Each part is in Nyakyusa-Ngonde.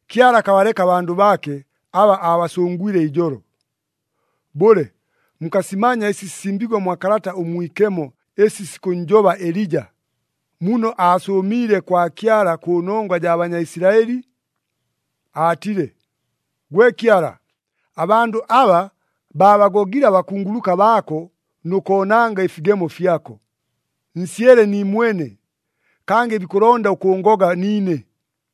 Kyala akabaleka abandʉ baake, aba aabasʉngwile ijolo. Bʉle, mukasimanya ɨsi sisimbiigwe mwa Kalata ʉMwikemo ɨsi sikʉnnjoba Elija, muno aasʉʉmiile kwa Kyala kʉnongwa jaa Banyaisilaɨli? Aatile, “Gwe Kyala, abandʉ aba, baabagogile abakunguluka baako nʉ koonanga ɨfigemo fyako. Nsyele niimwene, kangɨ bikʉlonda ʉkʉʉngoga niine!”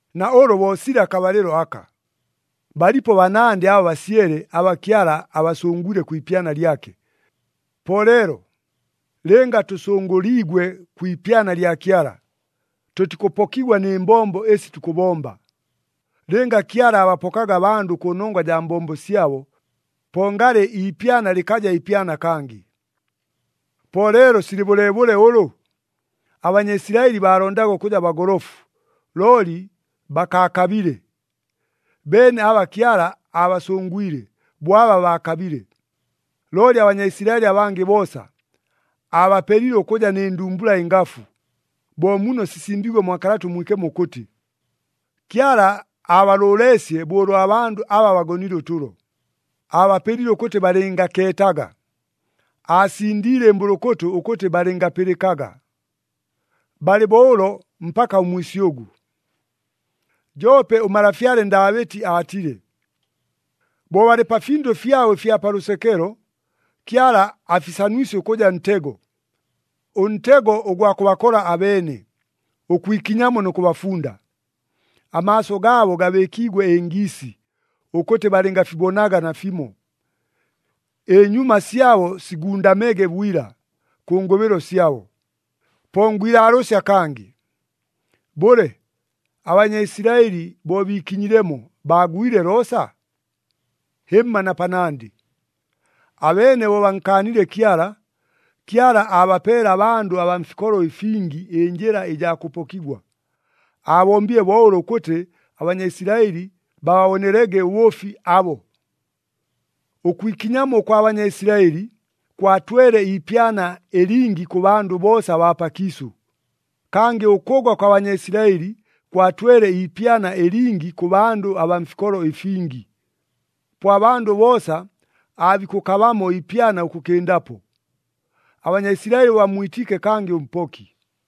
Na ʉlʉ bo silɨ akabalɨlo aka. Balipo banandɨ aba basyele aba Kyala abasʉngwile kwi ipyana lyake. Po leelo, lɨnga tʉsʉngʉliigwe kwi ipyana lya Kyala, tʉtikʉpokigwa nɨ mbombo ɨsi tukʉbomba. Lɨnga Kyala aabapokaga abandʉ kʉnongwa jaa mbombo syabo, po ngalɨ iipyana lɨkaja ipyana kangɨ. Po leelo silɨ bʉleebʉle ʉlʉ? ABanyaisilaɨli baalondaga ʉkʉja bagolofu, looli bakaakabile. Beene aba Kyala aabasʉngwile, bo aba baakabile. Looli aBanyaisilaɨli abangɨ boosa, aabapelile ʉkʉja nɨ ndumbula ɨngafu, bo muno sisimbiigwe mwa Kalata ʉMwikemo ʉkʉtɨ, “Kyala aabalʉʉleesye bo ʉlwa bandʉ aba bagonile ʉtʉlo, aabapelile ʉkʉtɨ balɨngakeetaga, aasindiile ɨmbʉlʉkʉtʉ ʉkʉtɨ balɨngapɨlɨkaga, balɨ bo ʉlo mpaka ʉmwisyʉgʉ.” Joope ʉmalafyale Ndaabɨti aatile, “Bo balɨ pa findʉ fyabo ɨfya pa lʉsekelo, Kyala afisanusye ʉkʉja ntego, ʉntego ʉgwa kʉbakola abeene, ʉkwikinyamo nʉ kʉbafunda. Amaaso gaabo gabɨɨkigwe ɨngiisi, ʉkʉtɨ balɨngafibonaga nafimo, ɨnyuma syabo sigundamege bwila, kʉ ngʉbɨlo syabo.” Po ngwilaalʉʉsya kangɨ, bʉle, aBanyaisilaɨli bo biikinyilemo, baagwile loosa? Hɨmma na panandɨ! Abeene bo bankaanile Kyala, Kyala aabapeele abandʉ abaa mfikolo ɨfingi ɨnjɨla ɨjaa kʉpokigwa. Aabombile bo ʉlo ʉkʉtɨ aBanyaisilaɨli bababonelege ʉbʉʉfi abo. Ʉkwikinyamo ʉkwa Banyaisilaɨli kwatwele iipyana ɨlingi kʉ bandʉ boosa abaa pakiisʉ, kangɨ ʉkʉgwa kwa Banyaisilaɨli kwatwele iipyana ɨlingi kʉ bandʉ abaa mfikolo ɨfingi. Po abandʉ boosa aabikʉkabamo iipyana ʉkʉkɨndapo, aBanyaisilaɨli bo bammwitiike kangɨ ʉMpoki.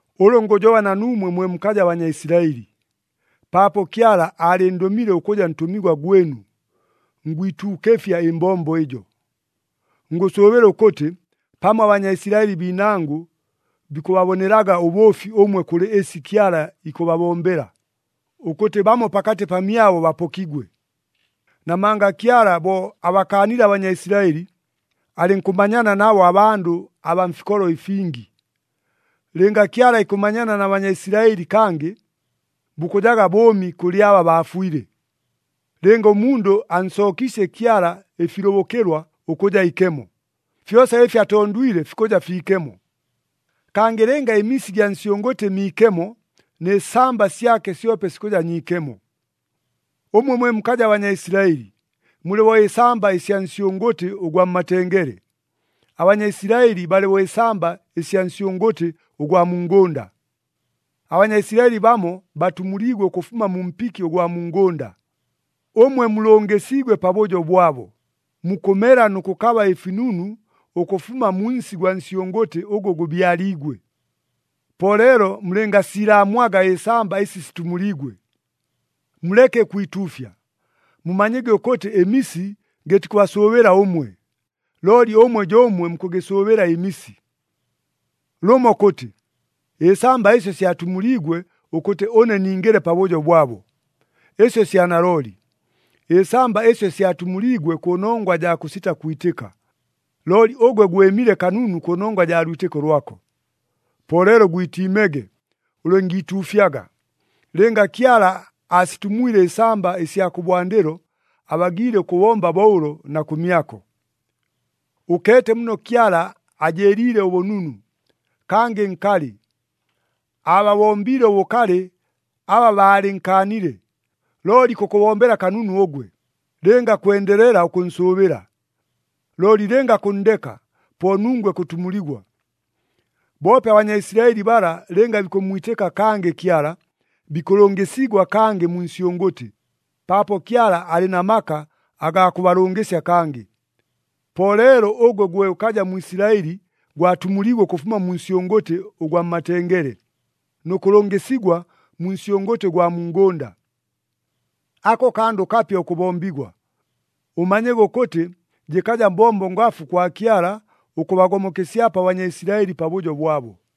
Ʉlʉ ngʉjoba na nuumwe mwe mukaja Banyaisilaɨli. Paapo Kyala aalɨndʉmile ʉkʉja ntʉmigwa gwɨnu, ngwituukɨfya ɨmbombo ɨjo. Ngʉsʉʉbɨla ʉkʉtɨ, pamo aBanyaisilaɨli biinangʉ bikʉbabonelaga ʉbʉʉfi ʉmwe kʉlɨ ɨsi Kyala ikʉbabombela, ʉkʉtɨ bamo pakatɨ pamyabo bapokigwe. Namanga Kyala bo abakaanile aBanyaisilaɨli, alɨnkʉmanyana nabo abandʉ abaa mfikolo ɨfingi. Lɨnga Kyala ikʉmanyana na Banyaisilaɨli kangɨ, bukʉjaga bʉʉmi kʉlɨ aba baafwile! Lɨnga ʉmundʉ ansookiisye Kyala ɨfilʉbʉkɨlwa ʉkʉja ikemo, fyosa ɨfi atondwile fikʉja fiikemo. Kangɨ lɨnga ɨmisi ɨgya nsyʉngʉtɨ miikemo, nɨ samba syake syope sikʉja nyiikemo. Ʉmwe mwe mukaja Banyaisilaɨli, mulɨ bo ɨsamba ɨsya nsyʉngʉtɨ ʉgwa mmatengele. ABanyaisilaɨli balɨ bo ɨsamba ɨsya nsyʉngʉtɨ ʉgwa mu ngʉnda. ABanyaisilaɨli bamo batumuliigwe ʉkʉfuma mu mpiki ʉgwa mu ngʉnda, ʉmwe mulʉngɨsiigwe pabʉjo bwabo, mukʉmela nʉ kʉkaba ɨfinunu ʉkʉfuma mu nsi gwa nsyʉngʉtɨ ʉgʉ gʉbyaliigwe. Po leelo mulɨngasiilaamwaga ɨsamba ɨsi situmuliigwe. Muleke ʉkwituufya. Mumanyege ʉkʉtɨ ɨmisi gɨtikʉbasʉʉbɨla ʉmwe, looli ʉmwe jo ʉmwe mukʉgɨsʉʉbɨla ɨmisi. Lʉmo kʉtɨ, “Ɨsamba ɨsyo syatumuliigwe ʉkʉtɨ ʉne ningɨle pabʉjo bwabo.” Ɨsyo sya nalooli. Ɨsamba ɨsyo syatumuliigwe kʉnongwa jaa kʉsita kwitɨka, looli ʉgwe gwɨmile kanunu kʉnongwa jaa lwitɨko lwako. Po leelo gwitiimege, ʉlɨngiituufyaga. Lɨnga Kyala aasitumwile ɨsamba ɨsya kʉbwandɨlo, abagiile ʉkʉbomba bo ʉlo na kʉmyako. Ʉkeete muno Kyala ajɨɨliile ʉbʉnunu, kangɨ nkalɨ. Aababombiile ʉbʉkalɨ aba baalɨnkaanile, looli ikʉkʉbombela kanunu ʉgwe, lɨnga kwendelela ʉkʉnsʉʉbɨla. Looli lɨnga kʉnndeka, po nungwe kʉtumuligwa. Boope aBanyaisilaɨli bala lɨnga bikʉmmwitɨka kangɨ Kyala, bikʉlʉngɨsigwa kangɨ mu nsyʉngʉtɨ, paapo Kyala alɨ na maka agaa kʉbalʉngɨsya kangɨ. Po leelo ʉgwe gwe ʉkaja Mwisilaɨli gwatumuliigwe ʉkʉfuma mu nsyʉngʉtɨ ʉgwa mmatengele, nʉ kʉlʉngɨsigwa mu nsyʉngʉtɨ ʉgwa mu ngʉnda. Ako kandʉ kapya ʉkʉbombigwa. Ʉmanyege ʉkʉtɨ jɨkaja mbombo ngafu kwa Kyala ʉkʉbagomokesyapo aBanyaisilaɨli pabʉjo bwabo!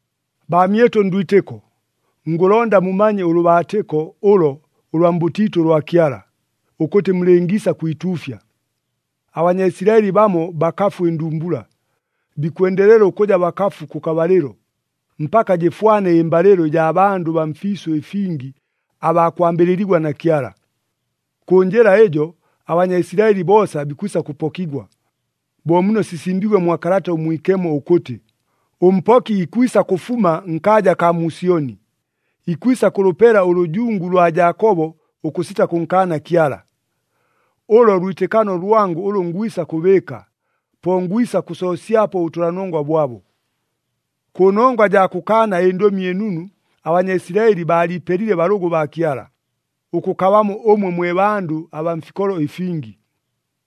Baamyɨtʉ ndwitɨko, ngʉlonda mumanye ʉlʉbaatɨko ʉlo ʉlwa mbʉtiitʉ ʉlwa Kyala, ʉkʉtɨ mulɨngiisa kwituufya. ABanyaisilaɨli bamo bakafu ɨndumbula, bikwendelela ʉkʉja bakafu kʉkabalɨlo, mpaka jɨfwane ɨmbalɨlo ɨjaa bandʉ baa mfiisʉ ɨfingi abaa kwambɨlɨligwa na Kyala. Kʉ njɨla ɨjo, aBanyaisilaɨli boosa bikwisa kʉpokigwa. Bo muno sisimbiigwe mwa Kalata ʉMwikemo ʉkʉtɨ, “ɄMpoki ikwisa kʉfuma nkaaja akaa mu Syoni, ikwisa kʉlʉpela ʉlʉjungu lwa Jaakobo ʉkʉsita kʉnkaana Kyala. Ʉlo lwitɨkano lwangʉ ʉlʉ ngwisa kʉbɨɨka, po ngwisa kʉsoosyapo ʉbʉtʉlanongwa bwabo.” Kʉnongwa jaa kʉkaana ɨNdʉmi ɨNunu, aBanyaisilaɨli baaliipelile balʉgʉ baa Kyala, ʉkʉkabamo ʉmwe mwe bandʉ abaa mfikolo ɨfingi.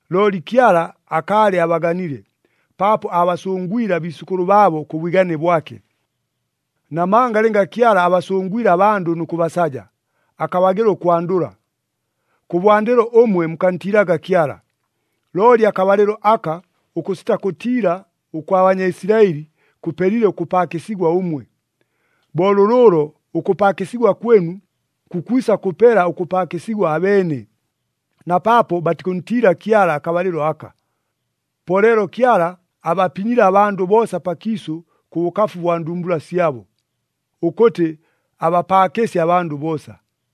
Looli Kyala akaalɨ abaganile, paapo aabasʉngwile abiisʉkʉlʉ baabo kʉ bwigane bwake. Namanga lɨnga Kyala abasʉngwile abandʉ nʉ kʉbasaja, akabagɨla ʉkwandʉla. Kʉbwandɨlo ʉmwe mukantiilaga Kyala, looli akabalɨlo aka ʉkʉsita kʉtiila ʉkwa Banyaisilaɨli kʉpelile ʉkʉpaakɨsigwa ʉmwe. Bo lʉlʉʉlo, ʉkʉpaakɨsigwa kwɨnu, kukwisa kʉpela ʉkʉpaakɨsigwa abeene, na paapo batikʉntiila Kyala akabalɨlo aka. Po leelo Kyala abapinyile abandʉ boosa pakiisʉ kʉ bʉkafu bwa ndumbula syabo, ʉkʉtɨ abapaakɨsye abandʉ boosa.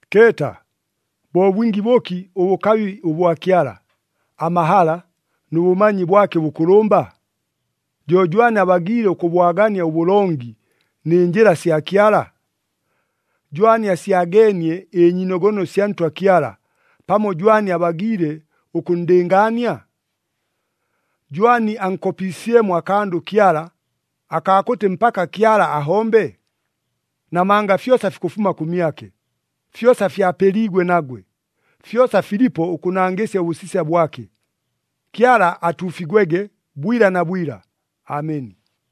Keeta, bo bwingi bʉki ʉbʉkabi ʉbwa Kyala, amahala nʉ bʉmanyi bwake ʉbʉkʉlʉmba? Jo jwani abagiile ʉkʉbwagania ʉbʉlongi, nɨ njɨla sya Kyala? “Jwani asyageenie ɨnyiinogono sya Ntwa Kyala, pamo jwani abagiile ʉkʉnndɨngaania?” “Jwani ankopiisyemo akandʉ Kyala, akaa kʉtɨ mpaka Kyala ahombe?” Namanga fyosa fikʉfuma kʉmyake, fyosa fyapeliigwe nagwe, fyosa filipo ʉkʉnangɨsya ʉbʉsisya bwake. Kyala atuufigwege bwila na bwila! Ameni.